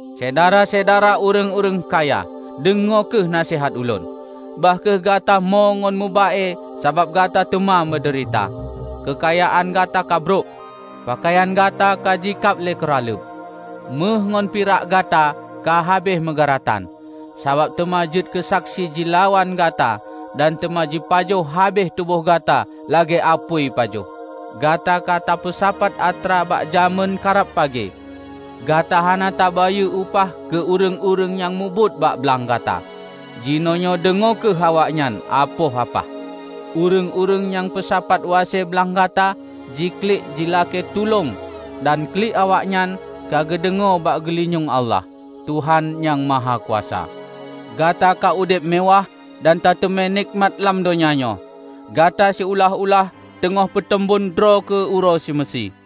Syedara-syedara, ureuëng-ureuëng kaya! Deungoe kheueh naseuhat ulôn. Bah kheueh gata mo ngon meuba-e sabab gata teuma meudeurita! Keukayaan gata kabrok. Peukayan gata ka jikab lé keuraleueb. Méuh ngon pirak gata ka habéh meugeuratan; sabab teuma jeuet keusaksi jilawan gata dan teuma jipajoh habéh tuboh gata lagée apui pajoh. Gata ka tapeusapat atra bak jamén karab pagée. Gata hana tabayeue upah keu ureuëng-ureuëng nyang mubuet bak blang gata. Jinoenyoe deungoe kheueh awaknyan apoh apah! Ureuëng-ureuëng nyang peusapat wase blang gata, jiklik jilakée tulông dan klik awaknyan ka geudeungoe bak geulinyueng Allah, Tuhan Nyang Mahakuasa. Gata ka udeb meuwáh dan tateumé nekmat lam donya nyoe. Gata siulah-ulah teungoh peuteumbon droe keu uroe seumeusie.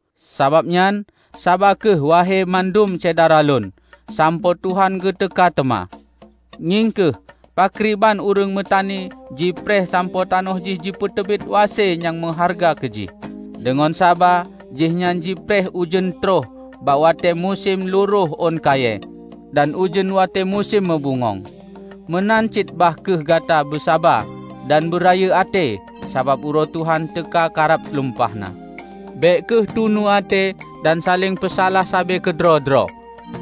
Sabab nyan, saba kheueh wahe mandum Syedara lôn, sampoe Tuhan geuteuka teuma. Ngieng kheueh pakriban ureuëng meutani jipreh sampoe tanoh jih jipeuteubiet wase nyang meuhareuga keu jih. Deungon saba jihnyan jipreh ujeuen tron bak watée musém lurôh ôn kayée dan ujeuen watée musém meubungöng. Meunan cit bah kheueh gata beusaba dan beurayeuk até, sabab uroe Tuhan teuka ka rab lumpah na. Bék kheueh tunu até dan saléng peusalah sabe keudroe-droe,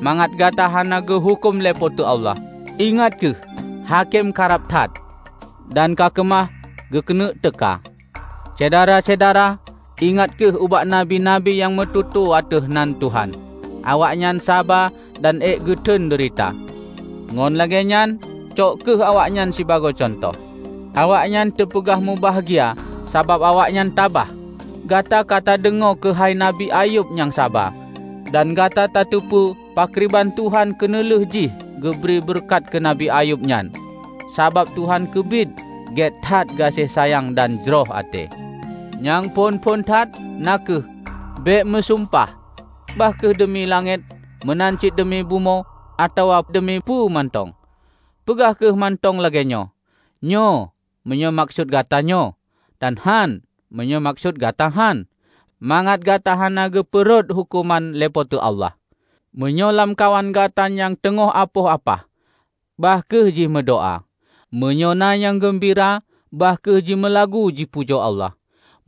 mangat gata hana geuhuköm lé Po teu Allah. Ingat kheueh! Hakém karab that, dan kakeumah geukeuneuk teuka. Syedara-syedara, ingat kheueh ubak nabi-nabi nyang meututoe ateueh nan Tuhan. Awaknyan saba dan ék geuteun deurita. Ngon lagée nyan, cok kheueh awaknyan sibagoe cuntoh. Awaknyan teupeugah mubahgia sabab awaknyan tabah. Gata ka tadeungoe keuhai Nabi Ayub nyang saba, dan gata tateupeue pakriban Tuhan keuneulheueh jih geubri beureukat keu Nabi Ayub nyan. Sabab Tuhan keubiet gét that gaséng sayang dan jroh até. Nyang phon-phon that, na kheueh: Bék meusumpah, bah kheueh deumi langét, meunan cit deumi bumoe, atawa deumi peue mantong. Peugah kheueh mantong lagée nyoe, "Nyoe" meunyoe meukeusut gata nyoe, dan "Hán" meunyoe meukeusut gata hán; mangat gata hana geupeurhot huköman lé Po teu Allah. Meunyoe lamkawan gata na nyang teungoh apoh apah, bah kheueh jimeudoá. Meunyoe na nyang geumbira, bah kheueh jimeulagu jipujoe Allah.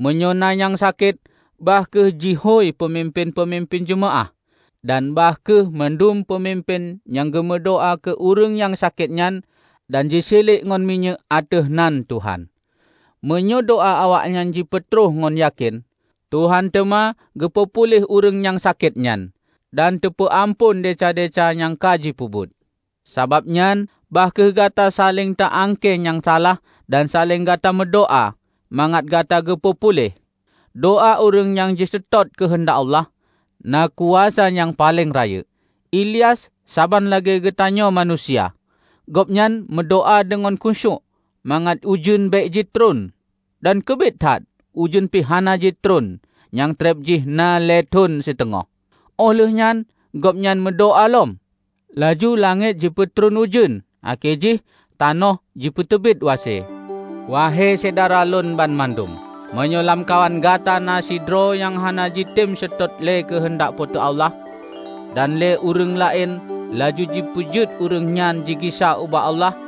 Meunyoe na nyang sakét, bah kheueh jihôi peumimpén-peumimpén jeumaáh. Dan bah kheueh mandum peumimpén nyan geumeudoá keu ureuëng nyang sakét nyan dan jisiliek ngon minyéuk ateueh nan Tuhan. Meunyoe doá awaknyan jipeutrok ngon yakén, Tuhan teuma geupeu puléh ureuëng nyang sakét nyan, dan teupeu amphon desya-desya nyang ka jipeubuet. Sabab nyan, bah kheueh gata saléng ta angkée nyang salah dan saléng gata meudoá, mangat gata geupeu puléh. Doá ureuëng nyang jiseutôt keuheundak Allah, na kuasa nyang paleng rayeuk. Ilyas saban lagée geutanyoe manusia. Gobnyan meudoá deungon khusyuék mangat ujeuen bék jitôh, dan keubiet that ujeuen pih hana jitôh nyang treb jih na lhée thon siteungoh. Óh lheueh nyan gobnyan meudoá lom, laju langét jipeutron ujeuen akhé jih tanoh jipeuteubiet wase. Wahe syedara lôn banmandum! Meunyoe lamkawan gata na sidroe nyang hana jitem seutôt lé keuheundak Po teu Allah, dan lé ureuëng laén laju ji peujeuet ureuëng nyan jigisa ubak Allah,